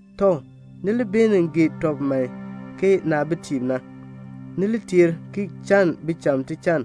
Tɔ, ni li beenin gee tɔb man ke naabitiib na. Ni li teer ki chann bicham tichann.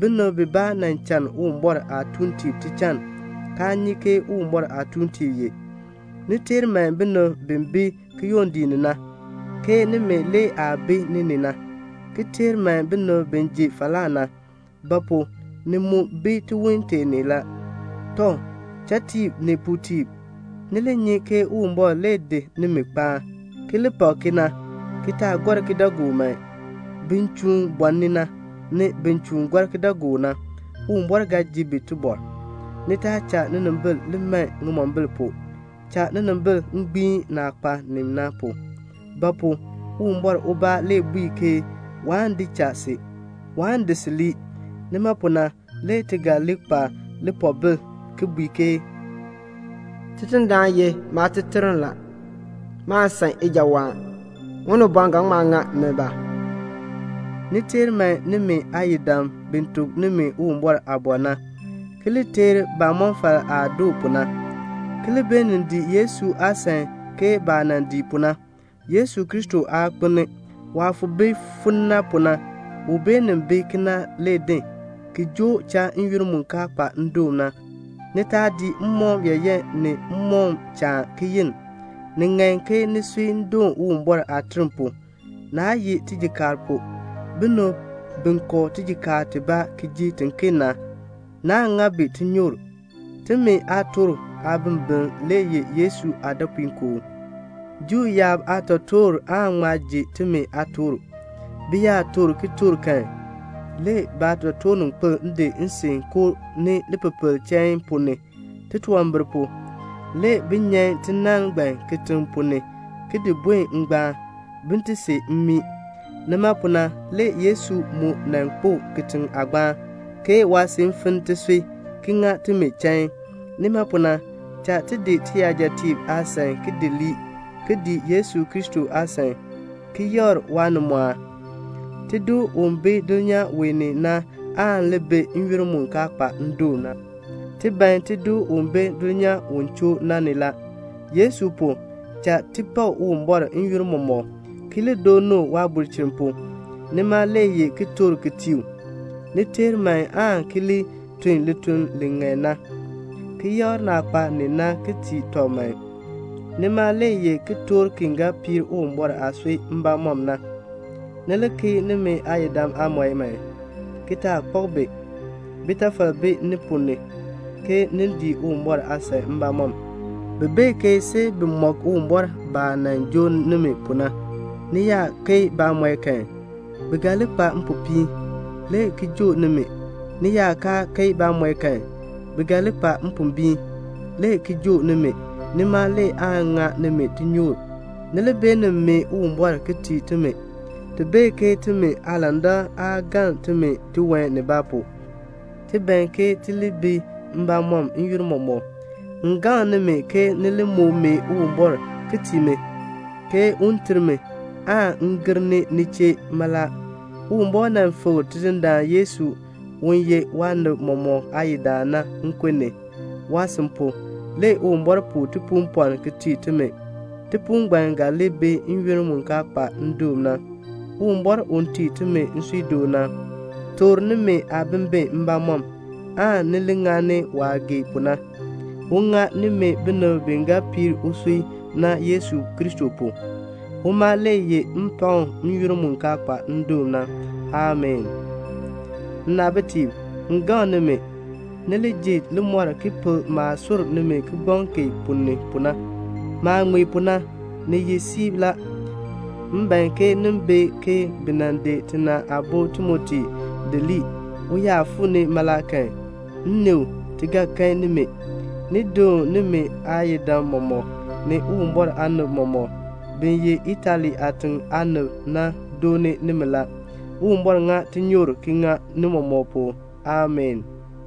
Binib bibaa nan chann Uwumbɔr aatuuntiib tichann, kaa nyi ke Uwumbɔr aatuuntiib ye. Ni teer man binib bi bi kiyondiik ni na, ke nimi le aah bi ni ni na, ki teer man binib bi ji falaa na. Ba pu? ni mu bi tiwon tee ni la. Tɔ, chatiib ni puutiib, ni li nyi ke Uwumbɔr kpaan nimi, ki li pak kena, ki taa gɔr kidaagook man. Bin chuun bɔɔni na, ni bin chuun gɔr kidaagook na, Uwumbɔr ga ji bi tibɔr. Ni taa cha ninimbil li man ŋimombil pu. Cha ninimbil gbiin naah kpa ni na pu. Ba pu? Uwumbɔr ubaa le bui ke waan di cha si. Waan di si lii. Nima pu na le ti ga li kpa lipoobil ki bui ke "Tidindaan ye maateterm la. Maan san ijawaan. Unibɔn ga ŋma ŋa mi ba?" Ni teer man nimi aayidam bi tuk nimi Uwumbɔr aaliin na, ki li teer baamɔfal aah doo pu na, ki li beenin dii Yesu aasan ke baah nan dii pu na. Yesu Kristo aa kpelni. Waah fo bi fon na pu na, u beenin bi kena le din, ki joo cha n-yoonn mu kaa kpa ndoon na. Ni taa dii mmɔkm yaayan ni mmɔkm chaan ki yenn. Ni ŋan ke nisui doon Uwumbɔr aaterm pu, naa ye tijikaar pu. Binib bi kɔ tijikaar tibaa ki ji tiken na, naa ŋa bi tinyoor. Timi aatork aabimbiln le ye Yesu aadɔpuinkoo. Juu yaab aatotoortiib aan ŋma ji timi aatork. Bi yaa toor kitork kan, le baatotoorninkpil di nsin koo ni lipepel chain ponn ni, titunwambir pu. Le bi nyan tinann ngbaan kitiŋ ponn ni ki di buen ngbaan, bin ti see mmii. Nima pu na le Yesu mu nan kpo kitiŋ aagbaan, ke waasin finn tisui, ki ŋa timi chain. Nima pu na, cha ti di tiyajatiib aasan ki di lii, ki dii Yesu Kristo aasan, ki yakr waanimɔɔn. Tido u bi dulnyaa wee ni na aan li bi n-yoonn mu kaa kpa ndoon na. Ti ban tido u bi dulnyaa u choo na ni la. Yesu pu, cha ti pak Uwumbɔr n-yoonn mɔmɔk, ki dooni u waabulchin pu. Nima le ye kitork ki tii u. Ni teer man aan ki tun lituln li ŋan na, ki yakr naah kpa ni na ki tii tɔb man. Nima le ye kitork ki ga piir Uwumbɔr aasui mbamɔm na. Ni li keei nimi aayidam aamɔi man, ki taa kpak bi. Bitafal bi ni ponn ni, ke ni dii Uwumbɔr aasan mbamɔm. Bi bee ke see bi mɔk Uwumbɔr baah nan joo nimi pu na. Ni yaa keei baamɔi kan, bi ga li kpa mpopiin, le ki joo nimi. Ni yaa kaa keei baamɔi kan, bi ga li kpa mpombiin, le ki joo nimi. Nima le aan ŋa nimi tinyoor. Ni li beenin mee Uwumbɔr ki tii timi. Ti bee ke timi aalandak aa galn timi tiwan nibaa pu. Ti ban ke ti li bi mbamɔm n-yoonn mɔmɔk. M gaŋ nimi ke ni li moo mee Uwumbɔr ki tii mi, ke un ter mi, m gir ni ni chee mala. Uwumbɔr nan fikr Tidindaan Yesu, u ye waanib mɔmɔk aayidaan na, nkun ni. Waasin pu, le Uwumbɔr puu tipuupɔln ki tii timi. Tipuul ngbaan ga li bi n-yoonn mu kaa kpa ndoon na. Uwumbɔr, u tii timi nsuudoon na, toor nimi aabimbin mbamɔm, aan ni li ŋani waah gee pu na. Un ŋa nimi binib bi ga piir usui na Yesu Kristo pu. Uma le yeh mpakm n-yoonn mu kaa kpa ndoon na. Amii. Nnaabitiib, m gaŋ nimi, ni li ji limɔr ki pel maah sur nimi kigbaŋ kee ponn ni pu na. Maah ŋmee pu na, ni ye siib la. M ban ke ni bee ke bi nan di tina aabo Timoti di lii. U yaa fuu ni mala kan, m ni u, ti ga kan nimi. Ni doon nimi aayidam mɔmɔk, ni Uwumbɔr aanib mɔmɔk. Bin ye Itali aatiŋ aanib na dooni nimi la. Uwumbɔr ŋa tinyoor ki ŋa ni mɔmɔk pu. Amii.